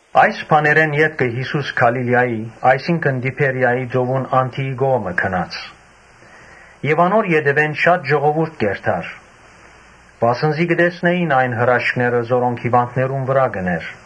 Այս բաներէն ետքը Յիսուս Գալիլիայի՝ այսինքն Տիբերիայի՝ ծովուն անդիի կողմը գնաց։ Անոր ետեւէն շատ ժողովուրդ կ’երթար, վասն զի կը տեսնէին այն հրաշքները, որոնք հիւանդներուն վրայ կ’ընէր։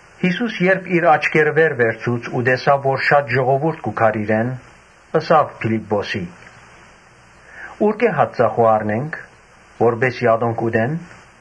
Յիսուս երբ իր աչքերը վեր վերցուց ու տեսաւ որ շատ ժողովուրդ կու գար իրեն, ըսաւ Փիլիպպոսին. «Ուրկէ՞ հաց ծախու առնենք, որպէս զի ատոնք ուտեն»։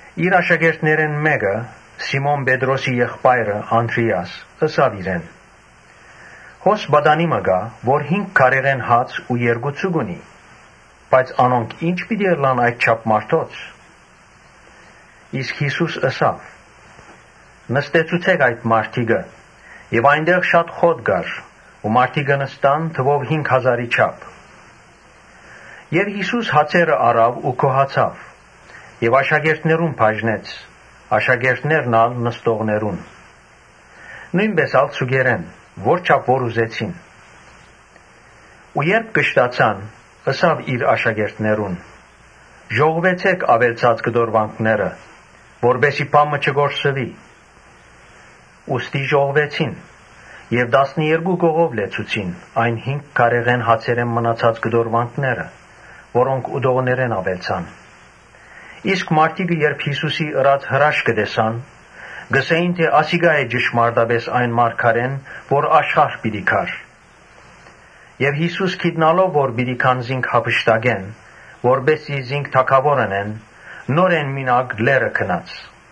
Իր աշակերտներէն մէկը, Սիմոն Պետրոսին եղբայրը Անդրէաս, ըսաւ իրեն. «Հոս պատանի մը կայ, որ հինգ գարիէ հաց ու երկու ձուկ ունի, բայց անոնք ի՞նչպէս պիտի բաւեն այդչափ մարդոց»։ Յիսուս ըսաւ. «Նստեցուցէ՛ք այդ մարդիկը»։ Հոն շատ խոտ կար։ Մարդիկը նստան՝ թուով հինգ հազարի չափ։ Յիսուս հացերը առաւ ու գոհացաւ եւ աշակերտներուն բաժնեց, աշակերտներն ալ՝ նստողներուն։ Նոյնպէս ալ ձուկերէն՝ որչափ որ ուզեցին։ Երբ կշտացան, ըսաւ իր աշակերտներուն. «Ժողվեցէ՛ք աւելցած կտորուանքները, որպէս զի բան մը չկորսուի»։ Ուստի ժողվեցին եւ տասներկու կողով լեցուցին այն հինգ գարիէ հացերէն մնացած կտորուանքները, որոնք ուտողներէն աւելցան։ Իսկ մարդիկը, երբ Յիսուսին ըրած հրաշքը տեսան, ըսին. «Ասիկա է ճշմարտապէս այն մարգարէն, որ աշխարհ պիտի գար»։ Յիսուս գիտնալով թէ պիտի գան զինք յափշտակեն, որպէս զի զինք թագաւոր ընեն, նորէն մինակը լեռը գնաց։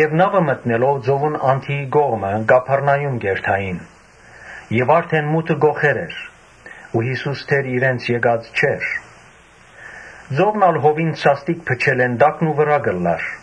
Նաւը մտնելով ծովուն անդիի կողմը՝ Կափառնայում գացին։ Արդէն մութը կոխեր էր, բայց դեռ Յիսուս իրենց եկած չէր։ Ծովն ալ հովին սաստիկ փչելէն տակնուվրայ կ’ըլլար։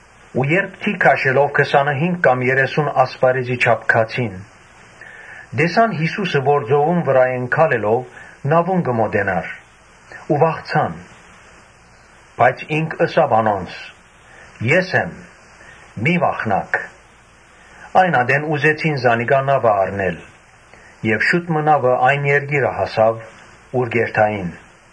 Երբ թի քաշելով քսանըհինգ կամ երեսուն ասպարէզի չափ գացին, տեսան Յիսուսը, որ ծովուն վրայէն քալելով՝ նաւուն կը մօտենար ու վախցան։ Բայց Յիսուս ըսաւ անոնց. «Ե՛ս եմ, մի՛ վախնաք»։ Այն ատեն զանիկա նաւը առին եւ նաւը շուտով այն երկիրը հասաւ՝ ուր կ’երթային։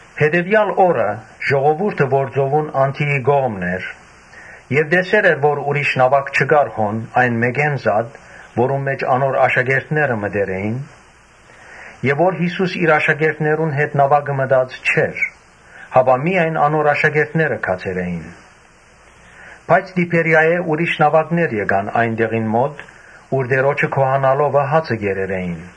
Հետեւեալ օրը ժողովուրդը որ ծովուն անդիի կողմն էր եւ տեսեր էր որ ուրիշ նաւակ չկար այն մէկէն զատ՝ որուն մէջ անոր աշակերտները մտեր էին, իսկ Յիսուս իր աշակերտներուն հետ նաւակը մտած չէր եւ միայն անոր աշակերտները գացեր էին. (Բայց Տիբերիայէն ուրիշ նաւակներ եկան այն տեղին մօտ՝ ուր Տէրոջը գոհանալովը հացը կերեր էին.)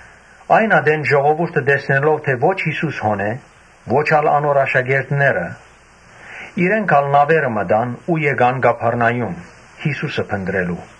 Այն ատեն ժողովուրդը տեսնելով թէ ո՛չ Յիսուսը հոն է, ո՛չ ալ անոր աշակերտները, իրենք ալ նաւերը մտան ու գացին Կափառնայում՝ Յիսուսը փնտռելու։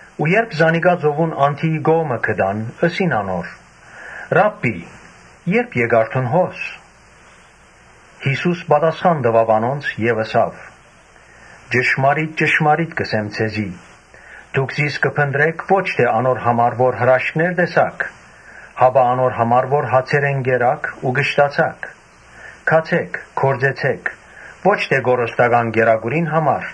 Ու երբ զանիկա ծովուն անդիի կողմը գտան, ըսին անոր. «Ռա՛բբի, ե՞րբ եկար դուն հոս»։ Յիսուս պատասխան տուաւ անոնց եւ ըսաւ. «Ճշմարիտ ճշմարիտ կ’ըսեմ ձեզի. ‘Դուք զիս կը փնտռէք՝ ո՛չ թէ անոր համար որ հրաշքներ տեսաք, հապա անոր համար որ հացերէն կերաք ու կշտացաք’։ Գացէ՛ք, գործեցէ՛ք, ո՛չ թէ կորստական կերակուրին համար,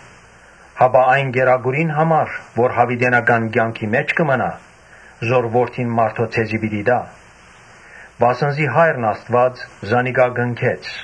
հապա այն կերակուրին համար, որ յաւիտենական կեանքի մէջ կը մնայ, որ Որդին մարդոյ ձեզի պիտի տայ, վասն զի Հայրն Աստուած զանիկա կնքեց»։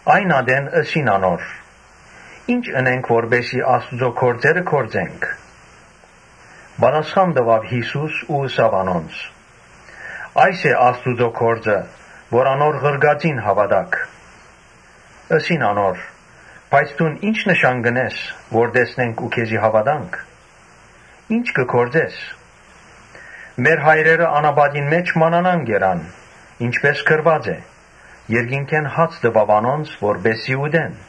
Այն ատեն ըսին անոր. «Ի՞նչ ընենք որպէս զի Աստուծոյ գործերը կատարենք»։ Պատասխան տուաւ Յիսուս ու ըսաւ անոնց. «Այս է Աստուծոյ գործը, որ անոր ղրկածին հաւատաք»։ Ըսին անոր. «Բայց դուն ի՞նչ նշան կ’ընես, որ տեսնենք ու քեզի հաւատանք. ի՞նչ կը գործես։ Մեր հայրերը անապատին մէջ մանանան կերան. ինչպէս գրուած է. ‘Երկնքէն հաց տուաւ անոնց որպէս զի ուտեն’»։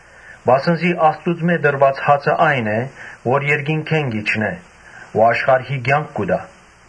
Վասն զի Աստուծմէ տրուած հացը ա՛յն է, որ երկնքէն կ’իջնէ ու աշխարհի կեանք կու տայ»։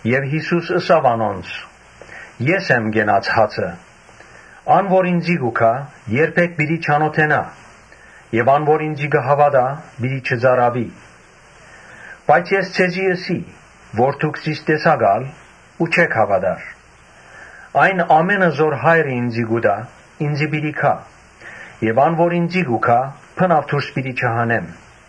Եւ Յիսուս ըսաւ անոնց. «Ես եմ կենաց հացը. ան որ ինծի կու գայ, երբեք պիտի չանօթենայ եւ ան որ ինծի կը հաւատայ, պիտի չծարաւի։ Բայց ես ձեզի ըսի թէ դուք զիս տեսաք ալ ու չէք հաւատար։ Այն ամէնը, որ Հայրը ինծի կու տայ, ինծի պիտի գան եւ ան, որ ինծի կու գայ, բնաւ դուրս պիտի չհանեմ։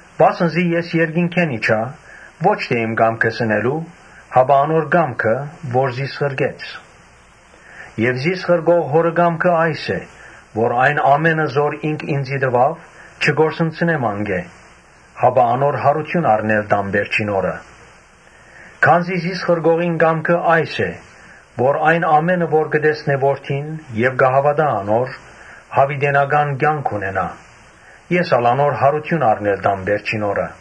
Վասն զի ես երկնքէն իջայ՝ ո՛չ թէ իմ կամքս ընելու, հապա անոր կամքը՝ որ զիս ղրկեց։ Եւ զիս ղրկող Հօրը կամքը այս է, որ այն ամէնը որ ինք տուաւ, չկորսնցնեմ, հապա անոնց յարութիւն առնել տամ վերջին օրը։ Քանզի զիս ղրկողին կամքը այս է, որ այն ամէնը որ կը տեսնեն Որդին եւ կը հաւատան անոր, յաւիտենական կեանք ունենան, ե՛ս ալ անոնց յարութիւն առնել պիտի տամ վերջին օրը»։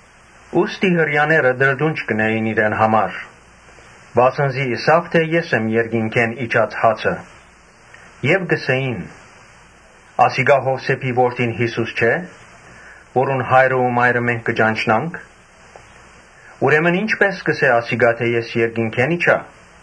Հրեաները կը տրտնջէին իրեն դէմ, վասն զի ըսաւ թէ՝ ‘Ե՛ս եմ երկնքէն իջած հացը’ Եւ կ’ըսէին «Ասիկա Յովսէփին որդին՝ Յիսուսը չէ՞, որուն հայրն ու մայրը մենք կը ճանչնանք. ուրեմն ի՞նչպէս կ’ըսէ ասիկա թէ՝ ‘Ես երկնքէն իջայ’»։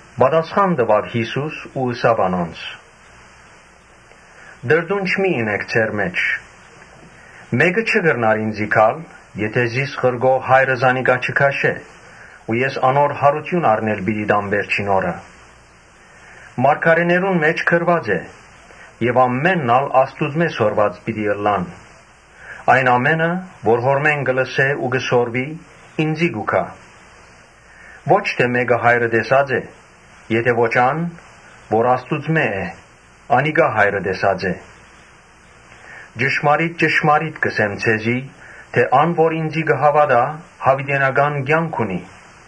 Պատասխանեց Յիսուս ու ըսաւ անոնց. «Տրտունջ մի՛ ընէք ձեր մէջ։ Մէկը չի կրնար ինծի գալ, եթէ զիս ղրկող Հայրը զանիկա չքաշէ ու ես անոր յարութիւն առնել պիտի տամ վերջին օրը Մարգարէները գրած են եւ ամէն ոք ալ Աստուծմէ սորված պիտի ըլլայ։ Այն, որ Հօրմէս կը լսէ ու կը սորվի, ինծի կու գայ։ Ոչ մէկը Հայրը տեսած է, այլ միայն ան՝ որ Աստուծմէ է, անիկա Հայրը տեսած է։ Ճշմարիտ ճշմարիտ կ’ըսեմ ձեզի թէ՝ ‘Ան որ ինծի կը հաւատայ, յաւիտենական կեանք ունի’։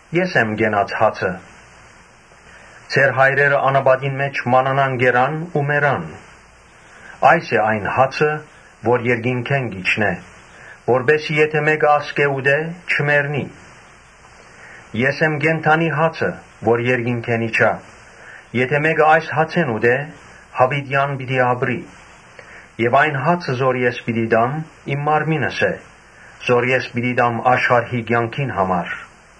Ես եմ կենաց հացը։ Ձեր հայրերը անապատին մէջ մանանան կերան ու մեռան։ Այս է այն հացը, որ երկնքէն կ’իջնէ, որպէս զի եթէ մէկը ատկէ ուտէ, չմեռնի։ Ես եմ կենդանի հացը, որ երկնքէն իջայ. Եթէ մէկը այս հացէն ուտէ, յաւիտեան պիտի ապրի եւ այն հացը՝ որ ես պիտի տամ՝ իմ մարմինս է, որը ես պիտի տամ աշխարհի կեանքին համար»։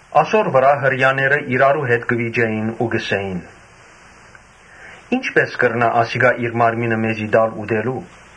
Ասոր վրայ հրեաները իրարու հետ կը վիճէին ու կ’ըսէին. «Ի՞նչպէս կրնայ ասիկա իր մարմինը մեզի տալ՝ ուտելու»։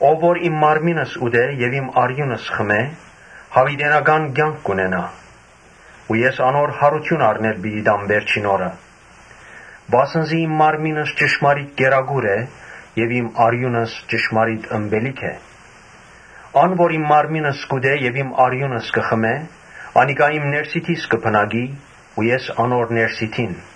Ո՛վ որ իմ մարմինս ուտէ եւ իմ արիւնս խմէ, յաւիտենական կեանք պիտի ունենայ ու ես անոր յարութիւն առնել պիտի տամ վերջին օրը։ Վասն զի իմ մարմինս ճշմարիտ կերակուր է եւ իմ արիւնս ճշմարիտ ըմպելիք է։ Ան որ իմ մարմինս կ’ուտէ եւ իմ արիւնս կը խմէ, անիկա իմ ներսիդիս կը բնակի ու ես անոր ներսիդին։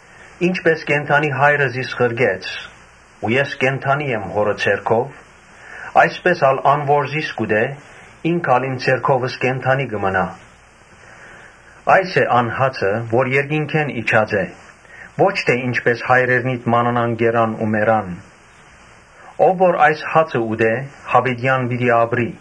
Ինչպէս կենդանի Հայրը զիս ղրկեց ու ես կենդանի եմ Հօրը ձեռքով, այսպէս ալ ան որ զիս կ’ուտէ, ինք ալ իմ ձեռքովս կենդանի պիտի մնայ։ Այս է այն հացը, որ երկնքէն իջած է, ո՛չ թէ մանանան, որ հայրերնիդ կերան ու մեռան։ Ո՛վ որ այս հացը ուտէ, յաւիտեան պիտի ապրի»։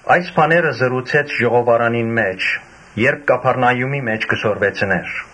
Այս բաները խօսեցաւ ժողովարանին մէջ՝ երբ Կափառնայումի մէջ կը քարոզէր։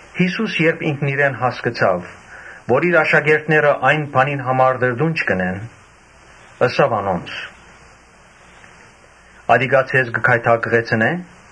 Յիսուս երբ հասկցաւ թէ իր աշակերտները այն բանին համար տրտունջ կ’ընեն, ըսաւ անոնց. «Ատիկա ձեզ կը գայթակղեցնէ՞։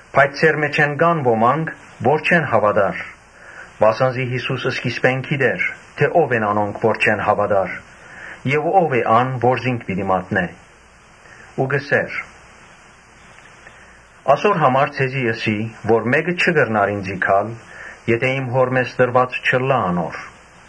Բայց ձեր մէջէն կան ոմանք, որ չեն հաւատար. վասն զի Յիսուս սկիզբէն գիտէր թէ որո՛նք չեն հաւատար եւ ո՞վ է ան, որ զինք պիտի մատնէ։ Ու ըսաւ. «Ասո՛ր համար ձեզի ըսի թէ մէ՛կը չի կրնար ինծի գալ, եթէ իմ Հօրմէս տրուած չըլլայ անոր»։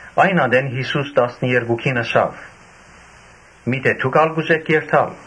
Այն ատեն Յիսուս տասներկուքին ըսաւ. «Միթէ դո՞ւք ալ կ’ուզէք երթալ»։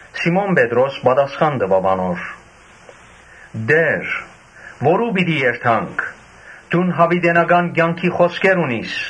Սիմոն Պետրոս պատասխան տուաւ անոր. «Տէ՛ր, որո՞ւ պիտի երթանք, դուն յաւիտենական կեանքի խօսքեր ունիս։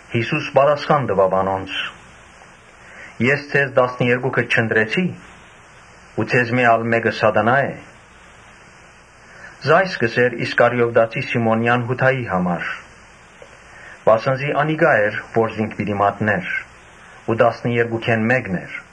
Յիսուս պատասխան տուաւ անոնց. «Ես ձեզ տասներկուքդ չընտրեցի՞, բայց ձեզմէ մէկը սատանայ է»։ Ասիկա կ’ըսէր Իսկարիովտացի Սիմոնեան Յուդային համար, վասն զի անիկա էր որ զինք պիտի մատնէր, թէեւ տասներկուքէն մէկն էր։